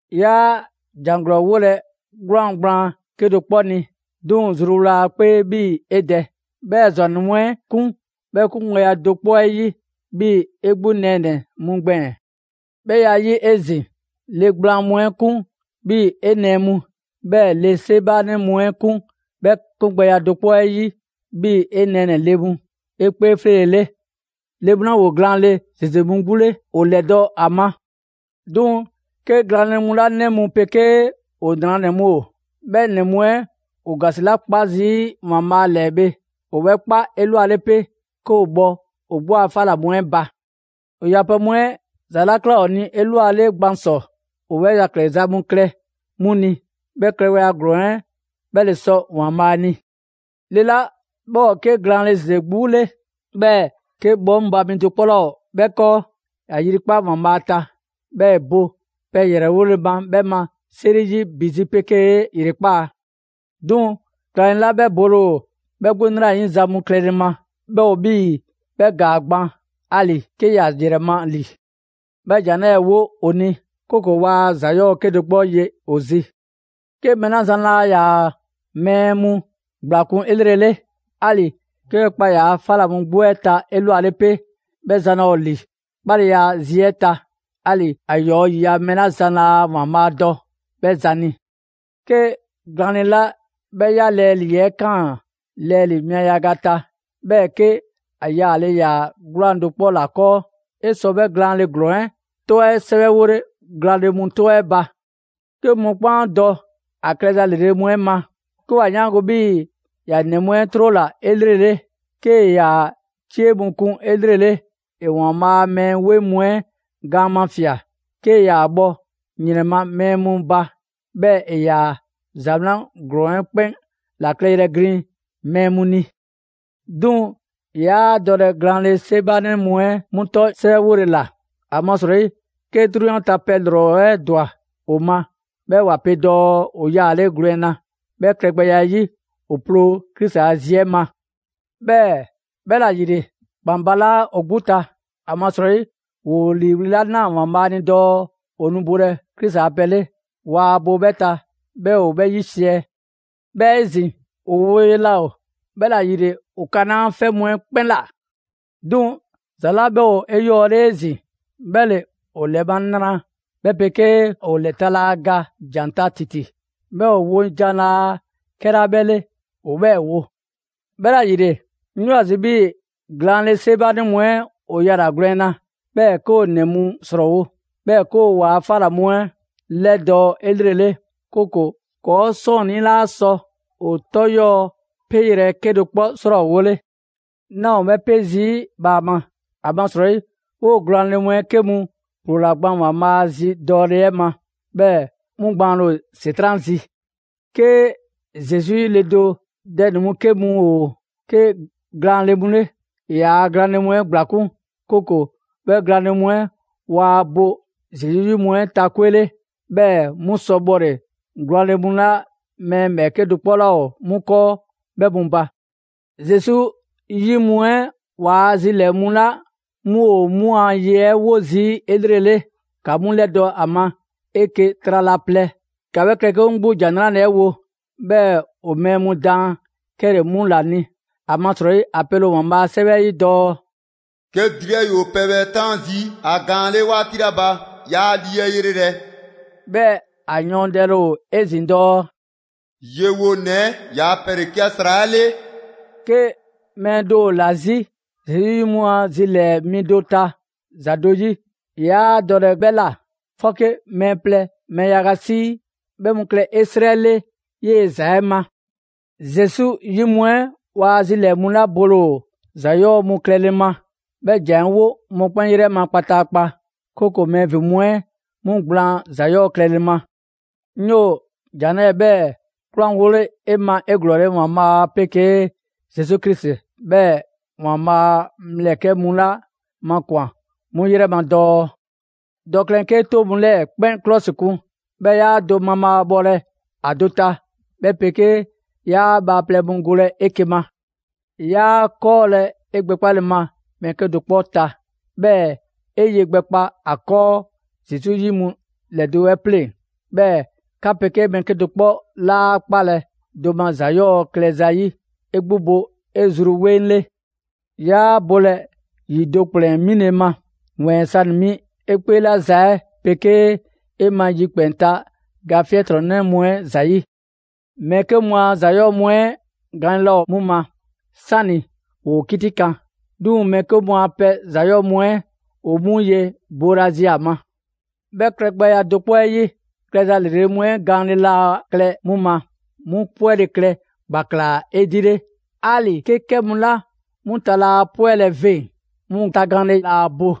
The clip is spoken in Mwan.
'Yaa ‑jan ‑glɔɔ 'wolɛ‑ 'gwlaan‑ gblaan 'kedo‑ 'kpɔ ni, 'duŋ‑ zruwla ‑a 'kpee 'bhii‑ 'e dɛ. 'Bhɛɛ‑ ‑zwannɛ mu 'ɛ 'kun 'bhɛ 'kungbɛya do 'kpɔ 'ɛ 'yi, 'bhii‑ 'e 'gbu nɛɛnɛ‑ mu gbɛɛn‑. 'Bhɛ ya 'ɛ 'yi 'ezin‑, le gblaan mu 'ɛ 'kun 'bhii‑ 'e nɛɛ mu, 'bhɛɛ‑ le 'seebaanɛ mu 'ɛ 'kun 'bhɛ klɛgbɛya do 'kpɔ 'ɛ 'yi 'bhii‑ 'e nɛɛnɛ‑ ‑le mu 'e 'kpee 'fleele‑ 'le. Le mu 'la ‑woo glaanle ‑zeze mu 'gbu 'le, ‑o ‑lɛdɔ' ‑a ma. 'Duŋ‑ 'ke glaanle mu 'la 'nɛ mu 'pegee ‑o 'nranɛ‑ mu ‑o, 'bhɛ ‑nɛ mu 'ɛ ‑woo ‑gasi 'la 'kpa zii' ‑Waanbhaa' ‑lɛɛ bhe, ‑o 'bhɛ 'kpa 'elwale 'pe 'ke ‑o bhɔ ‑o 'gbu a 'fa ‑la mu 'ɛ ba. ‑O yapɛ mu 'ɛ ‑za 'la ꞊kla ‑o ni 'elwale gban ‑sɔ, ‑o 'bhɛ yɛkɛ‑ za mu klɛ 'mu ni. 'Bhɛ klɛgbɛya ‑glɔɔn 'ɛ 'bhɛ ‑le sɔ ‑Waanbhaa' ni. Le 'la 'bhɛ ‑o 'ke glaanle ‑zeze 'gbu 'le, 'bhɛɛ‑ 'ke 'bhɔŋba‑ mi do 'kpɔ 'laa ‑o 'bhɛ 'kɔɔ, ‑ya ‑yrikpa' ‑Waanbhaa' ta, 'bhɛɛ‑ ‑e bo pɛ ‑yrɛwole ma 'bhɛ ma 'seri 'yi ‑bi zi 'pegee ‑yrekpaa'. 'Duŋ‑ glaanle 'la 'bhɛ bole ‑o 'bhɛ 'gbu 'nrayiza mu klɛle ma, 'bhɛ ‑o 'bhii‑ 'bhɛ ‑gaa gban 'ali‑ 'ke ‑ya ‑yrɛ ma ‑li. 'Bhɛ ‑jan 'lɛɛ‑ 'wo ‑o ni, 'kooko‑ waa ‑za 'yɔɔ‑ 'kedo‑ 'kpɔ ye ‑o zi. 'Ke mɛɛ 'la zan laa ‑yaa' mɛɛ mu ‑gblakun' 'elrele, 'ali‑ 'ke 'bhɛ kpa ‑yaa' pɛ 'fa ꞊la mu 'gbu 'ɛ ta 'elwale 'pe, 'bhɛ zan laa ‑o ‑li 'kpaleya zi 'ɛ ta; 'ali‑ ‑a ‑yɔɔ' ‑yiya' mɛɛ 'la zan laa ‑Waanbhaa' dɔ 'bhɛ zan ni. 'Ke glaanle 'la 'bhɛ 'ya lɛɛ ‑lii 'ɛ ꞊kaan lɛɛ mia yaga ta, 'bhɛɛ‑ 'ke ‑a yaale ‑yaa 'gwlaan‑ do 'kpɔ ‑la 'kɔɔ; 'e sɔ 'bhɛɛ‑ glaanle ‑glɔɔn 'ɛ 'tɔ 'ɛ sɛwɛwole glaanle mu 'tɔ 'ɛ ba. 'Ke mɔkpɛn' 'a dɔ ‑a klɛza ‑lrele' mu 'ɛ ma: 'ke ‑wa 'yaango‑ 'bhii‑ ‑ya ‑nɛ mu 'ɛ 'trola‑ 'elrele, 'kee‑ ‑yaa' 'cie mu kun 'elrele, ‑e ‑Waanbhaa' a mɛɛ 'weŋ mu 'ɛ gaan mafia‑, 'kee‑ ‑yaa bhɔ ‑yrɛn ma mɛɛ mu ba, 'bhɛɛ‑ ‑e ‑yaa ‑za 'wlan ‑glɔɔn 'ɛ 'kpɛn ‑la klɛyrɛ glin mɛɛ mu ni. 'Duŋ‑ 'yaa dɔlɛ glaanle 'seebaanɛ mu 'ɛ 'mu 'tɔ 'sɛwɛwole ‑la. ‑Amasrɔyi 'ke 'drunyan ta pɛ ‑lrɔ 'ɛ ‑dwa ‑o ma, 'bhɛɛ‑ ‑wa pe dɔɔ ‑o yaale' gwlɛn na; 'bhɛ klɛ gbɛya 'ɛ 'yi, ‑o ploo Krisi a zi 'ɛ ma. 'Bhɛɛ‑ 'bhɛla‑ ‑yile, ‑kpan balaa' ‑o 'gbu ta, ‑amasrɔyi ‑woo ‑liiwli' 'la 'naa‑ ‑Waanbhaa' ni dɔɔ ‑o nu bolɛ Krisi a pɛ 'le, waa bo 'bhɛ ta 'bhɛɛ‑ ‑o 'bhɛ 'yisiɛ‑. 'Bhɛɛ‑ 'ezin‑, ‑o woye laa ‑o, 'bhɛla‑ ‑yile ‑o kanaa' 'fɛ mu 'ɛ 'kpɛn ꞊la; 'duŋ‑ ‑za 'la 'bhɛ ‑o 'eyɔɔle 'ezin‑ 'bhɛ ‑le ‑o ‑lɛ ma nra, 'bhɛ 'pegee ‑o ‑lɛ ta laa ga ‑jan ta ‑titi. 'Bhɛɛ‑ ‑o wo jan laa 'kɛla 'bhɛ 'le ‑o 'bhɛɛ‑ wo. 'Bhɛla‑ ‑yile, 'ŋ 'yoo‑ ‑a zi 'bhii‑ glaanle 'seebaanɛ mu 'ɛ ‑o yala‑ gwlɛn na, 'bhɛɛ‑ 'ke ‑o ‑nɛ mu ‑srɔɔwo', 'bhɛɛ‑ 'ke ‑o waa 'fa ‑la mu 'ɛ 'lɛdɔɔ‑ 'elrele; 'kooko‑ ‑kɔɔ' 'sɔɔnnii 'laa sɔ ‑o 'tɔ 'yɔɔ‑ peyrɛ 'kedo‑ 'kpɔ 'srɔɔwole. 'Naa 'o 'bhɛ 'pe zii' bhaama, ‑amasrɔyi 'woo‑ glaanle mu 'ɛ 'ke mu ‑ploola gban ‑Waanbhaa 'a zi dɔɔle 'ɛ ma, 'bhɛɛ‑ 'mu gbaanle ‑o ‑Setran' zi. 'Ke Zesu 'yi le do dɛ ‑nɛ mu 'ke mu ‑o 'ke glaanle mu 'le, ‑e ‑yaa' glaanle mu 'ɛ ‑gblakun', 'kooko‑ 'bhɛ glaanle mu 'ɛ waa bo Zesu 'yi mu 'ɛ ta 'kwe 'le, 'bhɛɛ‑ 'mu sɔ bhɔle‑ glaanle mu 'la mɛɛ 'kedo‑ 'kpɔ 'laa ‑o 'mu 'kɔɔ 'bhɛ mu ba. Zesu 'yi mu 'ɛ ‑waa' zilɛɛ‑ mu 'la 'mu ‑o 'mu a ye 'ɛ 'wo zii' 'elrele, ‑ka 'mu 'lɛdɔ‑ ‑a ma 'eke‑ trala plɛ, ‑ka 'bhɛ klɛ 'kɛ mu 'gbu 'la ‑Jan 'Nrale‑ 'ɛ wo, 'bhɛɛ‑ ‑o mɛɛ mu daan 'kɛle‑ 'mu ‑la ni. ‑Amasrɔyi ‑a pele ‑o ‑Waanbhaa' a 'sɛwɛ 'ɛ 'yi dɔɔ: «'Ke dri 'ɛ ‑yoo pɛbhɛ 'taan zii' ‑a gaan 'ɛ 'le 'waati 'la ba, 'yaa ‑a ‑lii 'yrelɛ‑;» 'bhɛɛ‑ ‑a yɔɔndɛle ‑o 'ezin‑ dɔɔ: «Yewonɛ 'ɛ ‑yaa' pɛ ‑le 'ke ‑a ‑sra 'ɛ 'le.» 'Ke mɛɛ do ‑o ‑la 'zi Zesu 'yi mu a zilɛɛ‑ mi do ta ‑za do 'yi, 'yaa dɔlɛ 'bhɛ ꞊la; 'fɔke mɛɛ plɛ, mɛɛ yaga 'sii, 'bhɛɛ‑ 'mu klɛ 'e 'srɛ 'le 'yee‑ ‑za 'ɛ ma. Zesu 'yi mu 'ɛ ‑waa' zilɛɛ‑ mu 'la bole ‑o ‑za 'yɔɔ‑ mu klɛle ma, 'bhɛ ‑jan 'ɛ 'wo mɔkpɛn' 'yrɛ ma kpataakpa; 'kooko‑ mɛɛ ‑vin mu 'ɛ 'mu gblaan ‑za 'yɔɔ‑ klɛle ma. 'Ŋ 'yoo‑ ‑jan 'lɛɛ‑ 'bhɛɛ‑ 'kwlanwole 'e ma 'eglɔɔle ‑Waanbhaa' 'pegee Zesu Krisi 'bhɛɛ‑ ‑Waanbhaa' ‑mlɛkɛ' mu 'la makwan‑ 'mu 'yrɛ ma dɔɔ: Dɔ klɛn 'kee 'toŋ mu 'lɛɛ‑ 'kpɛn 'klɔsikun, 'bhɛɛ‑ 'yaa ‑a do mabhaabhɔlɛ ‑a do ta; 'bhɛ 'pegee 'yaa bhaaplɛŋ mu golɛ 'eke‑ ma. 'Yaa 'kɔɔlɛ‑ 'e gbɛkpale ma mɛɛ 'kedo‑ 'kpɔ ta, 'bhɛɛ‑ 'e ye gbɛkpa ‑a 'kɔɔ Zesu 'yi mu ‑lɛdo' 'ɛ 'pleŋ‑. 'Bhɛɛ‑ 'ka 'pegee mɛɛ 'kedo‑ 'kpɔ 'laa 'kpalɛ‑ do ma ‑za 'yɔɔ‑ klɛ zayi'. 'E 'gbu 'bo 'e zru 'weŋ 'le. 'Yaa bolɛ ‑yi do ‑kplɛn 'mile‑ ma; ‑wɛɛn sanɛ‑ 'mi 'e 'kpee 'la za 'ɛ 'pegee 'e ma yikpɛn‑ ta ga 'fiɛntrɔnnɛ mu 'ɛ ‑zayi'. Mɛɛ 'ke mu a ‑za 'yɔɔ‑ mu 'ɛ gaanle laa ‑o 'mu ma 'sani‑ ‑woo 'kitikan; 'duŋ‑ mɛɛ 'ke mu a pɛ ‑za 'yɔɔ‑ mu 'ɛ ‑o 'mu ye boolazi ‑a ma. 'Bhɛ klɛgbɛya do 'kpɔ 'ɛ 'yi, klɛza ‑lrele' mu 'ɛ gaanle laa klɛ 'mu ma, 'mu 'pwɛle‑ klɛ ‑gbaklaa 'edile; 'ali‑ 'ke 'kɛ mu 'la 'mu ta laa 'pwɛle‑ veŋ‑, 'mu tagaanle laa bo.